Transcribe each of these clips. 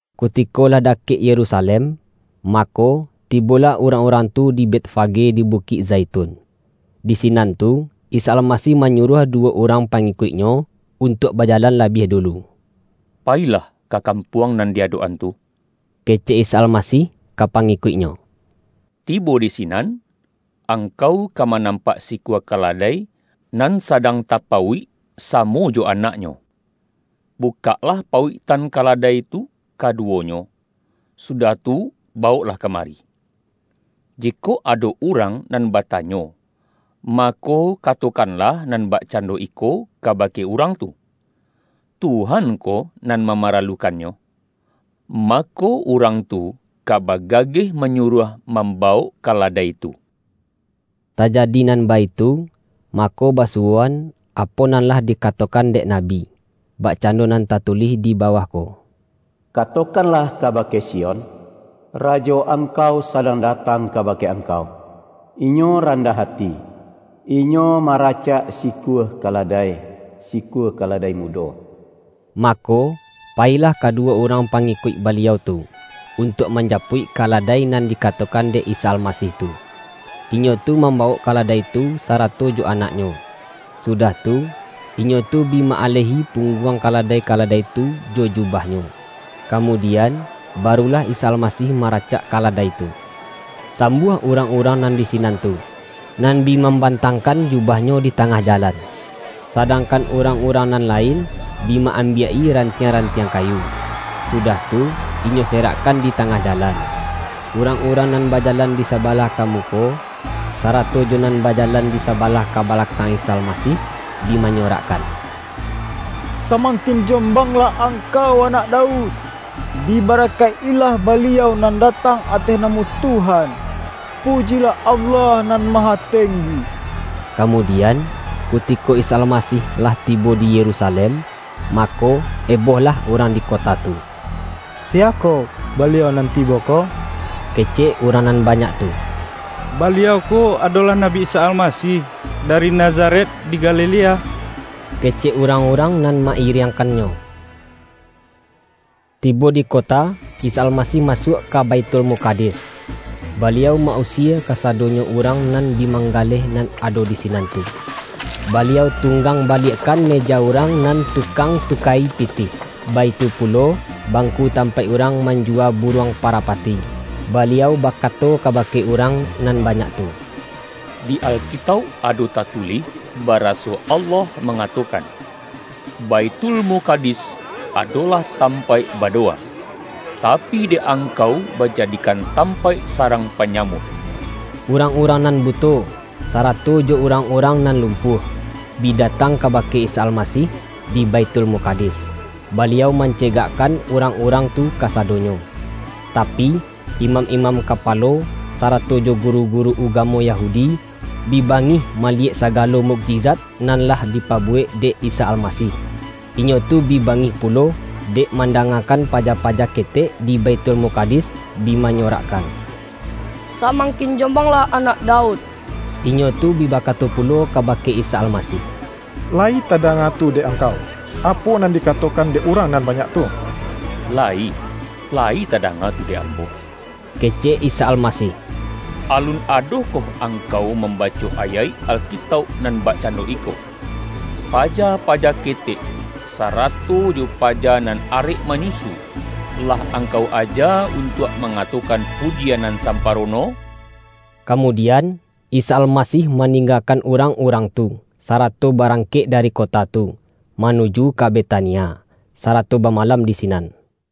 Kutiko lah dakek Yerusalem, mako, tibolah urang-urang tu di Betfage di Bukik Zaitun. Di sinan tu, Isa Almasih manyuruah duwo urang pangikuik-Nyo untuak baja-lan labiah dulu. ”Payilah ka kam-puang nan di adok-an tu,” kecek Isa Almasih ka pangikuik-Nyo.”Tibo di sinan, angkau ka manampak sikua kaladai, nan sadang tapauik samo jo anaknyo. Bukaklah pauiktan kaladai tu kaduwonyo, sudah tu bawoklah kamari. Jikok ado urang nan bata-nyo, mako, katokanlah nan bakcan-do iko kabake urang tu, ’Tuhan ko nan mamaralukannyo’, mako, urang tu ka bagageh manyuruah mamba-wok kaladai tu.” Tajadi nan baitu, mako basuwoan, apo nan lah dikatokan dek nabi, bak-cando nan tatulih di bawah ko, ”Katokanlah kabake Sion, Rajo angkau sadang datang kabake angkau. Inyo randah ati, Inyo maracak sikua kaladai, sikua kaladai mudo.” Mako, payilah kaduwo urang pa-ngikuik Baliau tu, untuak manjapuik kaladai nan dikatokan dek Isa Almasih tu. Inyo tu mambawok kaladai tu sa-rato jo anaknyo. Sudah tu, inyo tu bi ma-alehi pungguang kaladai-kaladai tu jo jubahnyo. Kamudian, barulah Isa Almasih maracak kaladai tu. Sam-buah urang-urang nan di sinan tu, nan bi mambantangkan jubahnyo di ta-ngah jalan, sadangkan urang-urang nan lain, bi ma-ambiak-i rantiang-ran-tiang kayu, sudah tu, inyo serakkan di tangah jalan. Urang-urang nan bajalan di sabalah ka muko, sarato jo nan bajalan di sabalah ka balakang Isa Almasih, bi manyorakkan,”Samang-kin jombanglah Angkau Anak Daud! Dibarakaik-ilah Baliau nan datang ateh namo Tuhan! Pujilah Allah Nan Ma-hatenggi!” Kamudian, kutiko Isa Almasih lah tibo di Yerusalem, mako, eboh-lah urang di kota tu.”Siya ko Baliau nan tibo ko?” kecek urang nan ba-nyak tu. ”Baliau ko adolah Nabi Isa Almasih, dari Nazaret di Galilea,” kecek urang-urang nan ma-iriangkan-Nyo. Tibo di kota, Isa Almasih masuak ka Baithulmukadis, Baliau ma-usie ka-sadonyo urang nan bi manggaleh nan ado di sinan tu. Baliau tunggang-baliak-kan meja urang nan tukang tuka-i pitih, baitu pulo, bangku tampaik urang manjuwa buruang parapati. Baliau bakato kabake urang nan banyak tu,”Di Alkitauk ado tatulih, baraso Allah mangatokan, ’Baithulmukadis adolah tampaik badowa.’ Tapi dek angkau ba-jadikan tampaik sarang panyamun!” Urang-urang nan buto, sarato jo urang-urang nan lumpuah, bi datang kabake Isa Almasih di Baithulmukadis, Baliau mancegakkan urang-urang tu kasadonyo. Tapi, imam-imam kapa-lo, sarato jo guru-guru ugamo Yahudi, bi bangih maliyek sagalo mukjizat nan lah dipabuwek dek Isa Almasih. Inyo tu bi bangih pulo, dek mandangakan paja-paja ketek di Baithulmukadis bi manyorakkan,”Samangkin jombang-lah Anak Daud!” Inyo tu bi bakato pulo kabake Isa Almasih,”Layi tadanga tu dek Ang-kau, apo nan dikatokan dek urang nan banyak tu?””Layi, layi tadanga tu dek Ambo,” kecek Isa Almasih.”Alun adokoh ang-kau mambaco ayaik Alkitauk nan bak-cando iko: ’Paja-paja ketek, sarato jo paja nan arek manyusu, lah Angkau aja untuak mangatokan pujian nan samparono'?” Kamudian, Isa Almasih maning-gakan urang-urang tu, sarato barang-kek dari kota tu, manuju ka Betania, sarato bamalam di sinan.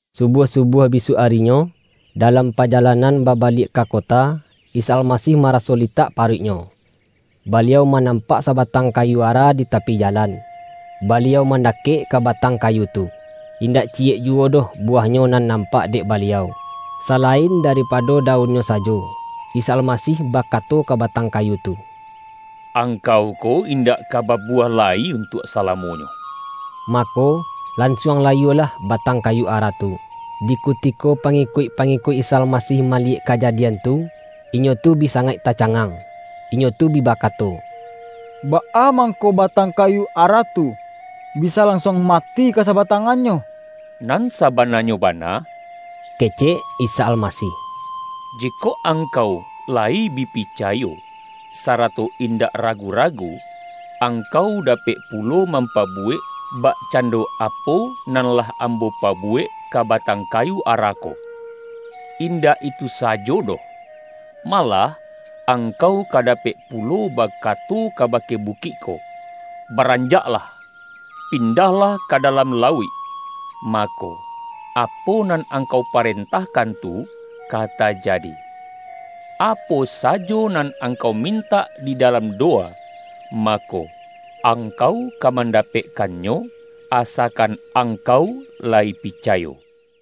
Subuah-subuah bisuak arinyo, da-lam pajalanan babaliak ka kota, Isa Almasih maraso litak paruik-Nyo. Baliau manampak sabatang kayu ara di tapi jalan. Baliau mandakek ka ba-tang kayu tu, indak ciyek juwo doh bu-wahnyo nan nampak dek Baliau, sala-in daripado daunnyo sajo. Isa Almasih bakato ka batang kayu tu,”Angkau ko indak ka babuwah lai untuak salamonyo!” Mako, lansuang layualah batang kayu ara tu. Di kutiko pangikuik-pangikuik Isa Almasih maliyek kajadian tu, inyo tu bi sangaik tacangang. Inyo tu bi ba-kato,”Baa mangko batang kayu ara tu, bisa lansuang mati ka sabatang-annyo?” ”Nan sabananyo bana,” kecek Isa Almasih,”jikok angkau layi bi pica-yo, sarato indak ragu-ragu, angkau dapek pulo mampabuwek, bakcando apo nan lah Ambo pabuwek ka batang kayu ara ko. Indak itu sajo doh, malah angkau ka dapek pulo bakato kabake bukik ko, ’Baranjaklah, pindahlah ka dalam lauik'; mako, apo nan angkau parentahkan tu, ka tajadi. Apo sa-jo nan angkau mintak di dalam dowa, mako, angkau ka mandapekkannyo, asakan angkau layi picayo.”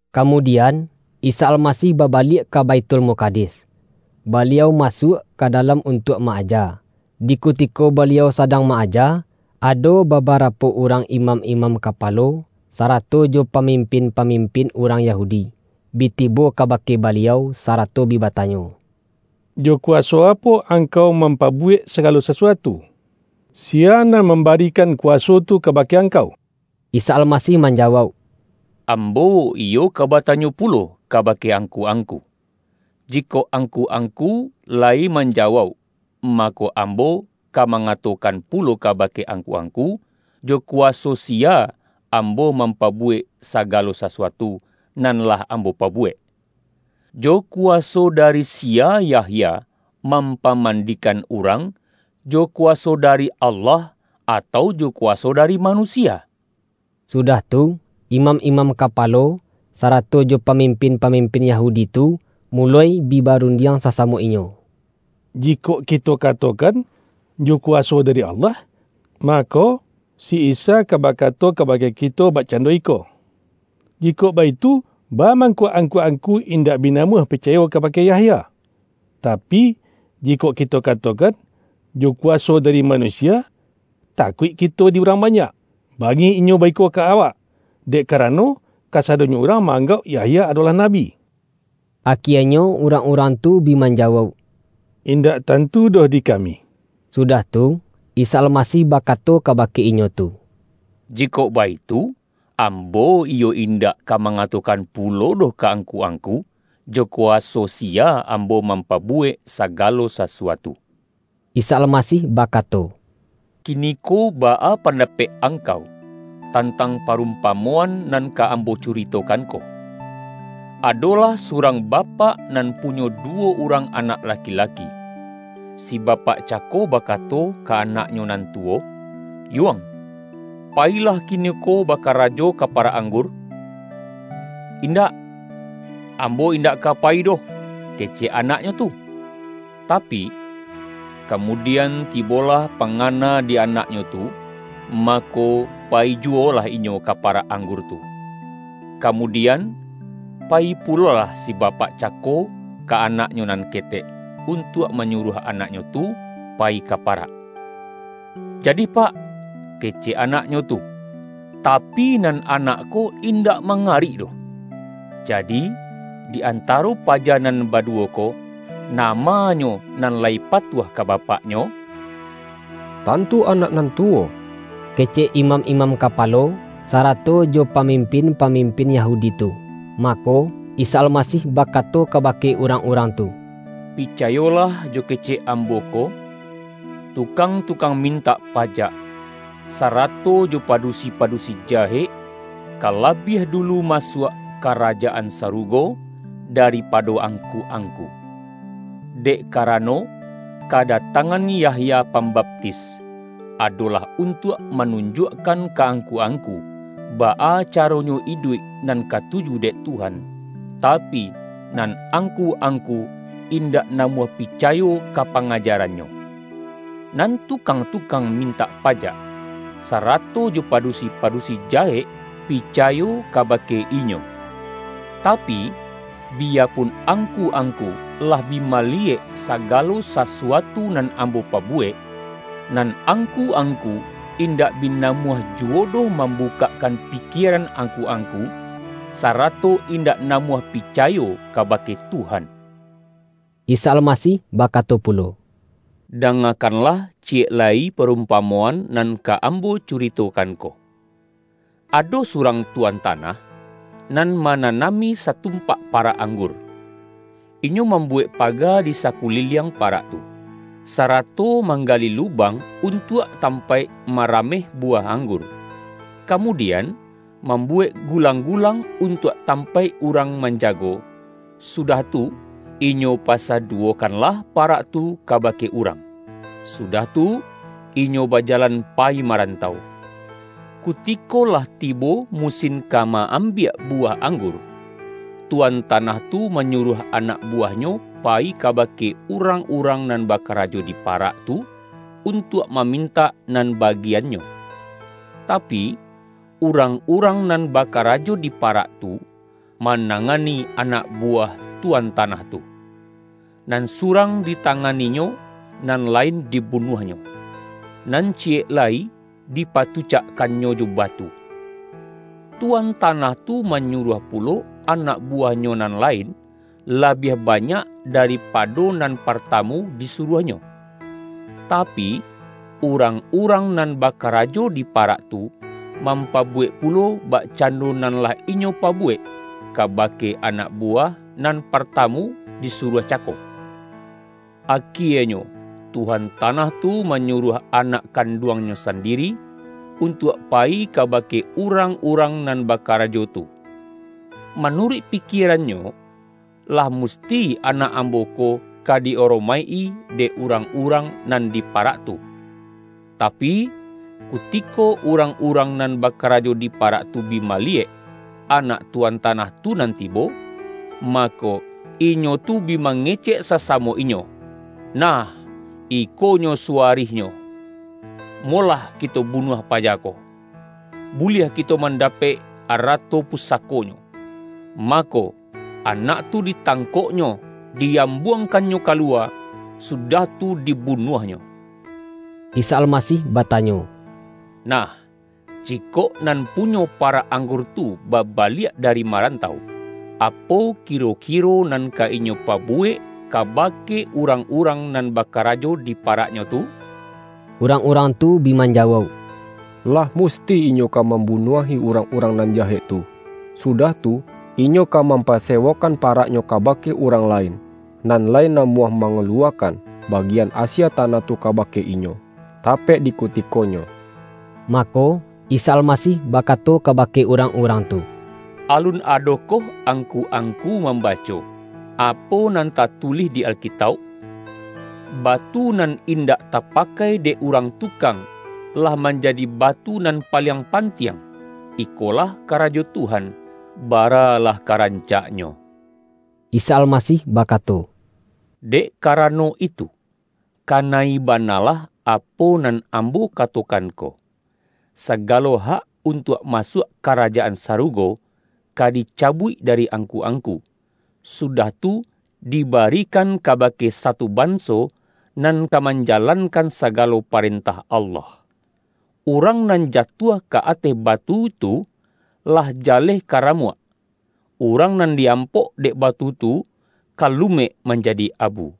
Kamudian, Isa Almasih babaliak ka Baithulmukadis, Baliau masuak ka dalam untuak ma-aja. Di kutiko Baliau sadang ma-aja, ado babarapo urang imam-imam kapalo, sarato jo pamim-pin-pamimpin urang Yahudi, bi tibo kabake Baliau sarato bi batanyo,”Jo kuwaso apo Angkau mampabuwek sa-galo sasuatu? Siya nan mambarikan kuwaso tu kabake Angkau?” Isa Almasih manjawauk,”Ambo iyo ka batanyo pulo kabake angku-angku. Jikok angku-angku layi man-jawauk, mako, Ambo ka mangatokan pulo kabake angku-angku, jo kuwa-so siya Ambo mampabuwek sagalo sasuatu, nan lah Ambo pabuwek. Jo kuwaso dari siya Yahya mampa-mandikan urang? Jo kuwaso dari Allah, atau jo kuwaso dari manusia?” Sudah tu, imam-imam kapalo, sa-rato jo pamimpin-pamimpin Yahudi tu, muloi bi barundiang sasamo inyo,”Jikok kito katokan, ’Jo kuwaso da-ri Allah.’ mako, si Isa ka bakato ka-bake kito bakcando iko, ’Jikok baitu, baa mangko angku-angku indak bi namuah picayo kabake Yahya?' Tapi, jikok kito katokan, ’Jo kuwaso dari ma-nusia.’ takuik kito di urang banyak, bangih inyo baiko ka awak, dek ka-rano, kasadonyo urang ma-anggauk Yahya adolah nabi.” Akienyo urang-urang tu bi manjawauk,”Indak tantu doh di kami.” Sudah tu, Isa Almasih bakato kabake inyo tu,”Jikok baitu, Ambo iyo indak ka mangatokan pulo doh ka angku-ang-ku, jo kuwaso siya Ambo mampabu-wek sagalo sasuatu.” Isa Almasih bakato”Kiniko baa pandapek angkau, tantang parumpa-moan nan ka Ambo curitokan ko? Ado-lah surang bapak nan punyo duwo urang anak laki-laki. Si bapak cako bakato ka anaknyo nan tuwo, ’Yuang, payilah kiniko bakarajo ka parak ang-gur.’ ’Indak, ambo indak ka payi doh.’ kecek anaknyo tu. Tapi, kamu-dian tibolah pangana di anaknyo tu, mako, payi juwolah inyo ka parak ang-gur tu. Kamudian, payi pulolah si bapak cako ka anaknyo nan ketek, untuak manyuruah anaknyo tu payi ka parak. ’Jadih pak.’ kecek anaknyo tu. Tapi, nan anak ko indak mangga-rik doh. Jadi, di antaro paja nan baduwo ko, namanyo nan lai patuah ka bapaknyo?””Tantu anak nan tuwo,” kecek imam-imam kapalo, sarato jo pamimpin-pa-mimpin Yahudi tu. Mako, Isa Almasih bakato kabake urang-urang tu,”Picayolah jo kecek Ambo ko: Tukang-tukang mintak pa-jak, sarato jo padusi-padusi jahek, ka labiah dulu masuak Karajaan Sarugo daripado angku-angku. Dek karano, kadatangan Yahya Pambaptis, adolah untuak manunjuakkan ka angku-ang-ku, baa caronyo iduik nan katuju dek Tuhan, tapi nan angku-angku indak na-muah picayo ka pangajarannyo; nan tukang-tukang mintak pajak, sarato jo padusi-padusi jahek picayo kabake inyo. Tapi, biyapun angku-angku lah bi maliyek sagalo sasuatu nan Ambo pabuwek, nan angku-angku indak bi namuah juwo doh mambukakkan pi-kieran angku-angku, sarato indak na-muah picayo kabake Tuhan.” Isa Almasih bakato pulo,”Danga-kanlah ciyek lai parumpamoan nan ka Ambo curitokan ko. Ado surang tuan tanah, nan mananami satumpak pa-rak anggur. Inyo mambuwek paga di sakuliliang parak tu, sarato mangga-li lubang untuak tampaik marameh buwah anggur, kamudian, mambu-wek gulang-gulang untuak tampaik urang manjago, sudah tu, inyo pasa-duwokanlah parak tu kabake urang, sudah tu inyo bajalan payi marantau. Kutiko lah tibo musin ka ma-am-biak buwah anggur, tuan tanah tu ma-nyuruah anak buwahnyo payi kaba-ke urang-urang nan bakarajo di parak tu, untuak mamintak nan bagiannyo. Tapi, urang-urang nan bakarajo di parak tu, manangani anak buwah tu-an tanah tu: Nan surang ditanganinyo, nan lain dibunuahnyo, nan ciyek lai dipatucakkannyo jo batu. Tuan ta-nah tu manyuruah pulo anak buwah-nyo nan lain, labiah banyak daripado nan partamu disuruahnyo. Tapi, urang-urang nan bakarajo di parak tu, mam-pabuwek pulo, bakcando nan lah inyo pabuwek, kabake anak buwah nan partamu disuruah cako. Akienyo tuan tanah tu manyuruah anak kanduangnyo sandiri, untuak payi kaba-ke urang-urang nan bakarajo tu. Ma-nuruik pikierannyo, ’Lah musti anak ambo ko ka di-aromaik-i dek urang-urang nan di parak tu'. Tapi, kuti-ko urang-urang nan bakarajo di pa-rak tu bi maliyek, anak tuan tanah tu nan tibo, mako, inyo tu bi mange-cek sasamo inyo, ’Nah, ikonyo suwa-rihnyo. Molah kito bunuah paja ko, buliah kito mandapek arato pusako-nyo!’ Mako, anak tu ditangkoknyo, di-ambuangkannyo kaluwa, sudah tu dibunuahnyo.” Isa Almasih batanyo,”Nah, jikok nan punyo parak anggur tu babaliak dari marantau, apo kiro-kiro nan ka inyo pabuwek, kabake urang-urang nan bakarajo di paraknyo tu?” Urang-urang tu bi manjawauk,”Lah musti inyo ka mambunuahi urang-urang nan jahek tu, sudah tu, inyo ka mampasewokan paraknyo ka-bake urang lain, nan lai namuah ma-ngaluwakan, bagian asie tanah tu ka-bake inyo, tapek dikutikonyo.” Mako, Isa Almasih bakato kaba-ke urang-urang tu,”Alun adokoh ang-ku-angku mambaco, apo nan tatulih di Alkitauk? ’Batu nan indak tapakai dek urang tukang, lah manjadi batu nan paliang pantiang. Ikolah karajo Tuhan; baralah karancaknyo!’” Isa Almasih bakato,”Dek karano itu, kana-i banalah apo nan Ambo ka-tokan ko, sagalo hak untuak masuak Karajaan Sarugo, ka dicabuik dari ang-ku-angku, sudah tu di barikan kabake satu banso, nan ka manjalankan saga-lo parentah Allah. [ Urang nan ja-tuah ka ateh batu tu, lah jaleh ka ra-muak; urang nan di-ampok dek batu tu, ka lumek manjadi abu.]"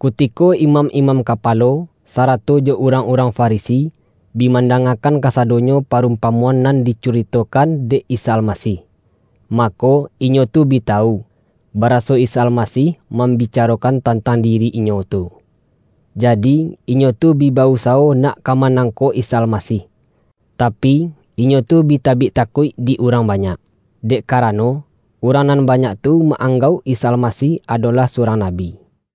Kutiko imam-imam kapalo, sarato jo urang-urang Farisi, bi mandangakan kasadonyo parumpamoan nan dicuri-tokan dek Isa Almasih, mako, inyo tu bi tawu, baraso Isa Almasih mambi-carokan tantang diri inyo tu. Jadi, inyo tu bi ba-usawo nak ka manang-kok Isa Almasih. Tapi, inyo tu bi tabik takuik di urang banyak, dek karano, urang nan banyak tu ma-anggauk Isa Almasih adola h surang nabi.